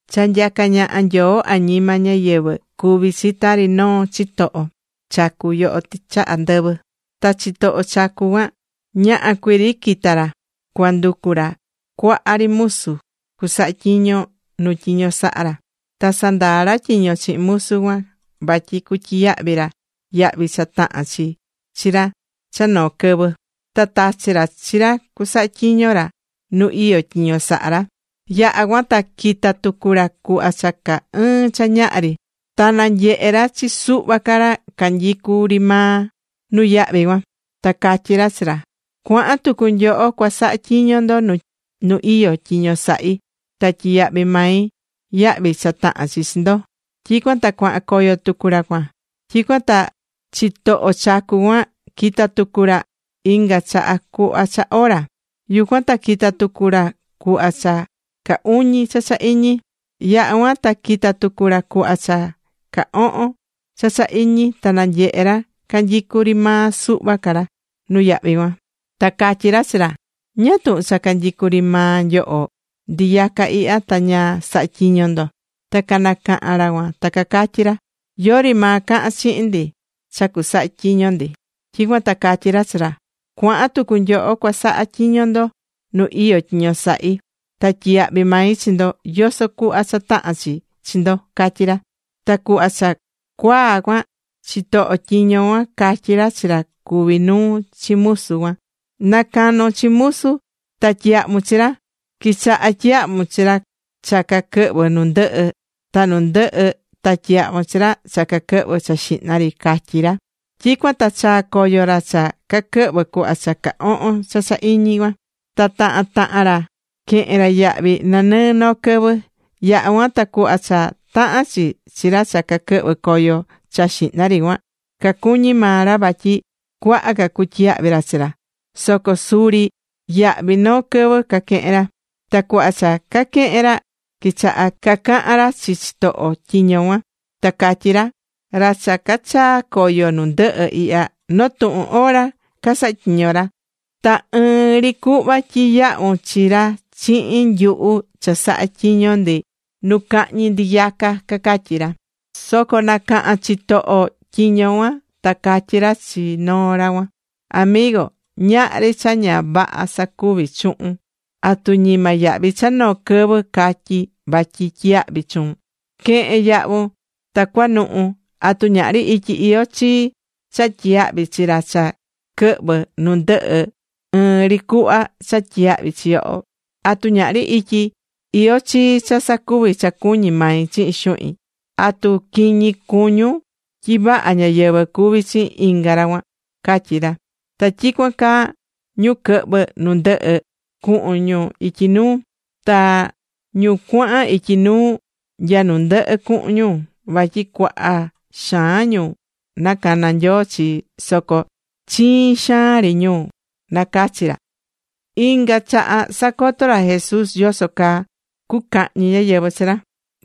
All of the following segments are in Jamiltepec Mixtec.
’Cha nyacá ñaha Nyoo añima ñáyɨvɨ, cuví chi tari noo chitoho chacu yoho tɨchaha ndɨvɨ. Ta chitoho chacu cuan ñaha cuiri quita̱ ra cuanducu ra cuaha ri musu cusaha tyiño nu tyiño saha ra. Ta sandaa̱ ra tyiño chihin musu cuan vatyi cutyiyahvi ra yahvi cha tahán chi chi ra cha noo quɨvɨ, ta tachi̱ ra chi ra cusaha tyiño ra nu iyó tyiño sahá ra. Yaha̱ cuan ta quita̱ tucu ra cuhva cha caa ɨɨn cha ñaha ri. Ta nanyehe̱ ra chi suhva ca ra canyicú ri maa nuyahvi cuan. Ta catyí ra chi ra: “Cua̱han tucu nyoho cua saha tyiño ndo nu iyó tyiño sahí, ta tyiyahvi mai yahvi cha tahán chi chi ndo.” Tyicuan ta cuahan coyo tucu ra cuan. Tyicuan ta chitoho chacu cuan quita̱ tucu ra inga chaha cuhva cha ora. Yucuan ta quita̱ tucu ra cuhva cha caa uñi cha cha iñi. Ta yaha̱ cuan ta quita̱ tucu ra cuhva cha caa ohon cha cha iñi ta nanyehe̱ ra canyicú ri maa suhva ca ra nuyahvi cuan. Ta catyí ra chi ra: “¿Ñáá tuhun cha canyicú ri maa nyoho ndiyaca ihya, ta ña sahá tyiño ndo?” Ta canacaha̱n ra cuan ta catyí ra: “Yori maa caha̱n chihin ndi cha cusaha tyiño ndi.” Tyicuan ta catyí ra chi ra: “Cua̱han tucu nyoho cua saha tyiño ndo nu iyó tyiño sahí. Ta tyiyahvi mai chi ndo yoso cuhva cha tahán chi chi ndo”, catyí ra. Ta cuhva cha cuaa cuan, chitoho tyiño cuan catyí ra chi ra cuví nuu chi musu cuan: “Na canon chi musu, ta tyi̱yahvun chi ra. Qui̱chaha tyiyahvun chi ra cha caquɨhvɨ̱ nu ndɨhɨ, ta nu ndɨhɨ ta tyi̱yahvun chi ra cha caquɨhvɨ̱ cha xihna ri”, catyí ra. Tyicuan ta chaa̱ coyo ra cha caquɨhvɨ̱ cuhva cha caa ohon cha cha iñi cuan. Ta tahan tahan ra quehe̱n ra yahvi nanɨɨ noo quɨvɨ. Yaha̱ cuan, ta cuhva cha tahán chi chi ra cha caquɨhvɨ̱ coyo cha xihna ri cuan, cacuñí maa ra vatyi cuaha ca cutyiyahvi ra chi ra. Soco suri ɨɨn ri yahvi noo quɨvɨ caquehe̱n ra. Ta cuhva cha caquehe̱n ra, quichaha̱ cacahan ra chi chitoho tyiño cuan. Ta catyí ra: “Ra cha cachaa̱ coyo nu ndɨhɨ ihya, noo tuhun hora casaha̱ tyiño ra. Ta ɨɨn ri cuhva tyiyahvu̱n chi ra chihin nyuhu cha saha̱ tyiño ndi nu cahñi ndiyaca”, cacatyí ra. Soco nacaha̱n chitoho tyiño cuan, ta catyí ra chi noo ra cuan: “Amigo, ñahri cha ña vaha sacuví chuhun. ¿Atu ñima yahvi cha noo quɨvɨ catyi̱ vatyi tyiyahvi chuun? Que̱hen yahvun, ta cua̱nuhu. ¿Atu ñahri ityi iyó chii cha tyiyahvi chi ra cha quɨhvɨ̱ nu ndɨhɨ ɨɨn ri cuhva cha tyiyahvi̱ chi yoho? ¿Atu ñahri ityi iyó chii cha sacuvi cha cuñí mai chihin xuhin? ¿Atu quiñi cuñún tyi vaha ñáyɨvɨ cuví chihin inga ra cuan?” catyí ra. Ta tyicuan caa ñu quɨhvɨ̱ nu ndɨhɨ, cuhun ñu ityi nuu. Ta ñu cuahan ityi nuu, nya nu ndɨhɨ cuhun ñu. Vatyi cuaha xaan ñu nacaná Nyoo chi. Soco chiin xaan ri ñu nacachí ra.Inga chaha sacotó ra Jesús yoso caa cucahñi ñáyɨvɨ chi ra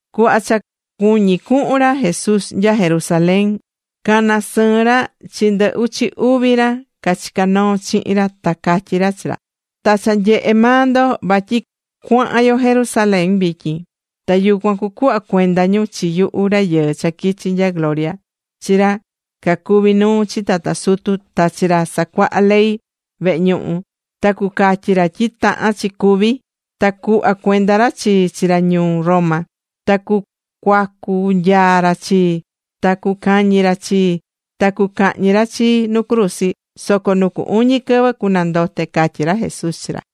Cuhva cha cuñí cuhun ra Jesús nya Jerusalén, cana̱ sɨɨn ra chi ndɨ uchi uvi ra cachicá noo chihin ra ta catyí ra chi ra: ―Ta cha nyehe̱ maa ndo vatyi cuahan yo Jerusalén vityin. Ta yucuan cucuhva cuenda ñu chi yuhu Rayɨɨ cha quichi̱ nya gloria chi ra cacuví nuu chi tata sutu, ta chi ra casacuaha ley vehe ñuhu, ta cucatyi ra tyi tahán chi cúvi. Ta cucuhva cuenda ra chii chi ra ñuu Roma, ta cucuacu nyaa ra chii, ta cucañi ra chii, ta cucahñi ra chii nu cruzi. Soco nu cu uñi quɨvɨ cunandote ―catyí ra Jesús chi ra.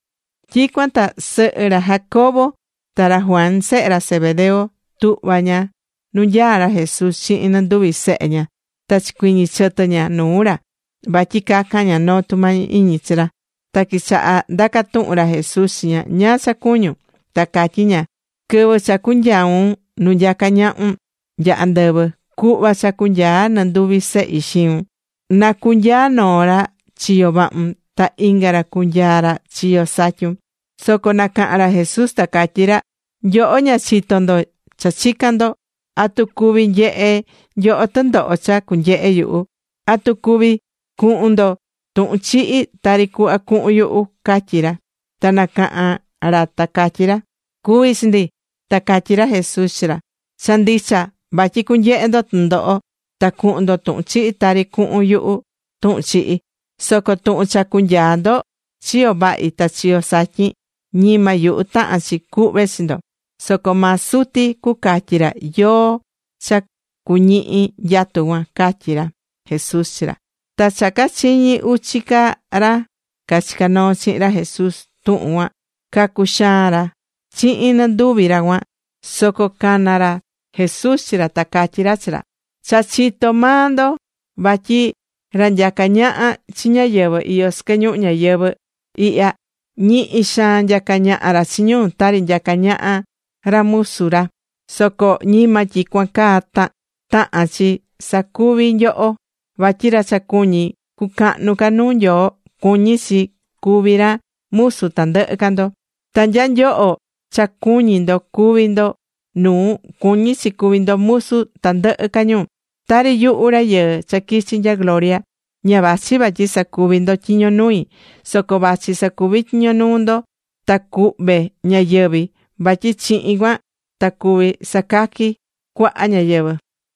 Tyicuan ta sɨhɨ ra Jacobo ta ra Juan sehe ra Zebedeo tuhva̱ ña nu nyaá ra Jesús chihin nɨnduvi sehe ña. Ta chicuiñi̱ chɨtɨ ña nuu ra vatyi cacan ña noo tumañi iñi chi ra. Ta quichaha̱ ndaca tuhun ra Jesús chi ña: ―¿Ñáá cha cuñún? Ta catyí ña: ―Quɨvɨ cha cunyaun nu nyacá ñahun nya andɨvɨ, cu̱hva cha cunyaa nɨnduvi sehi xiun. Na cunyaa noo ra chiyo vahun, ta inga ra cunyaa ra chiyo satyun. Soco nacaha̱n ra Jesús ta catyí ra: ―Nyoho ña chitó ndo cha chicán ndo. ¿Atu cuví nyehe nyoho tɨndoho cha cunyehe yuhu? ¿Atu cuví cuhun ndo tuhun chihi tari cuhva cuhun yuhu? ―catyí ra. Ta canacaha̱n ra ta catyí ra: ―Cuví chi ndi. Ta catyí ra Jesús chi ra: ―Cha ndicha vatyi cunyehe ndo tɨndoho, ta cuhun ndo tuhun chihi tari cuhun yuhu tuhun chihi. Soco tuhun cha cunyaa ndo chiyo vahi ta chiyo satyin, ñima yuhu tahán chi cuhve chi ndo, soco maa Suti cucatyi ra yóó cha cuñihi nyatu cuan ―catyí ra Jesús chi ra. Ta cha cachiñi̱ uchi ca ra cachicá noo chihin ra Jesús tuhun cuan cacuxaa̱n ra chihin nɨnduvi ra cuan. Soco cana̱ ra Jesús chi ra ta catyí ra chi ra: ―Cha chitó maa ndo, vatyi ra nyacá ñaha chi ñáyɨvɨ iyó sɨquɨ ñuhu ñayɨvɨ̱ ihya, ñihi xaan nyacá ñaha ra chi ñu tari nyaca ñaha ra musu ra. Soco ñima tyicuan caa tahán chi sacuvi nyoho. Vatyi ra cha cuñí cucahnu ca nu Nyoo, cuñí chi cuví ra musu tandɨhɨ ca ndo. Ta nya nyoho cha cuñí ndo cuví ndo nuu, cuñí chi cuví ndo musu tandɨhɨ ca ñu. Tari yuhu Rayɨɨ cha quichi nya gloria, ña vachi vatyi sacuvi ndo tyiño nui, soco vachi sacuvi tyiño nuu ndo, ta cuhve ñayɨvi̱. Vatyi chihin cuan ta cuvi sacaqui cuaha ñáyɨvɨ.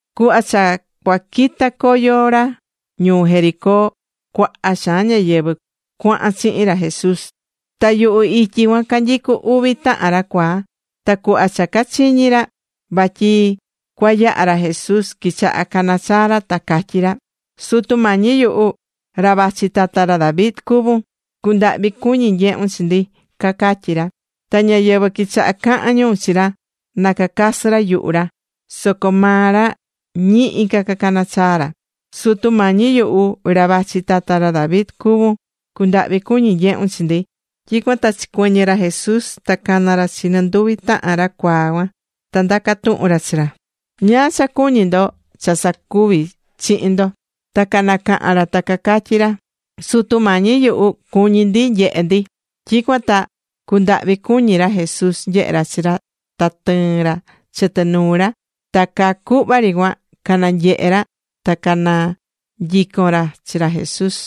Cuhva cha cua quitá coyo ra ñuu Jericó, cuaha xaan ñáyɨvɨ cuahan chihin ra Jesús. Ta yuhu ityi cuan canyicú uvi tahan ra cuaa. Ta cuhva cha cachiñi̱ ra vatyi cua yaha ra Jesús, quichaha̱ canachaa ra. Ta catyí ra: ―Sutu Mañi yuhu, ra vachi tata ra David cuvún. ¡Cu̱ndahvi cuñi nyehun chi ndi! ―cacatyí ra. Ta ñáyɨvɨ quichaha cahan ñu chi ra na cacasɨ ra yuhu ra. Soco maa ra ñihi ca cacana̱ chaa ra: ―Sutu Mañi yuhu, ra vachi tata ra David cuvún. ¡Cu̱ndahvi cuñi nyehun chi ndi! Tyicuan ta chicuɨñɨ̱ ra Jesús ta cana̱ ra chi nɨnduvi tahan ra cuaa cuan, ta ndaca̱ tuhun ra chi ra: ―¿Ñáá cha cuñí ndo cha sacuvi chihin ndo? Ta canacaha̱n ra ta catyí ra: ―Sutu Mañi yuhu, cuñí ndi nyehe ndi. Tyicuan ta cundahvi cuñí ra Jesús nyehe ra chi ra, ta tɨɨ̱n ra chɨtɨ nuu ra. Ta caa cuhva ri cuan cananyehe̱ ra, ta cananyico̱n ra chi ra Jesús.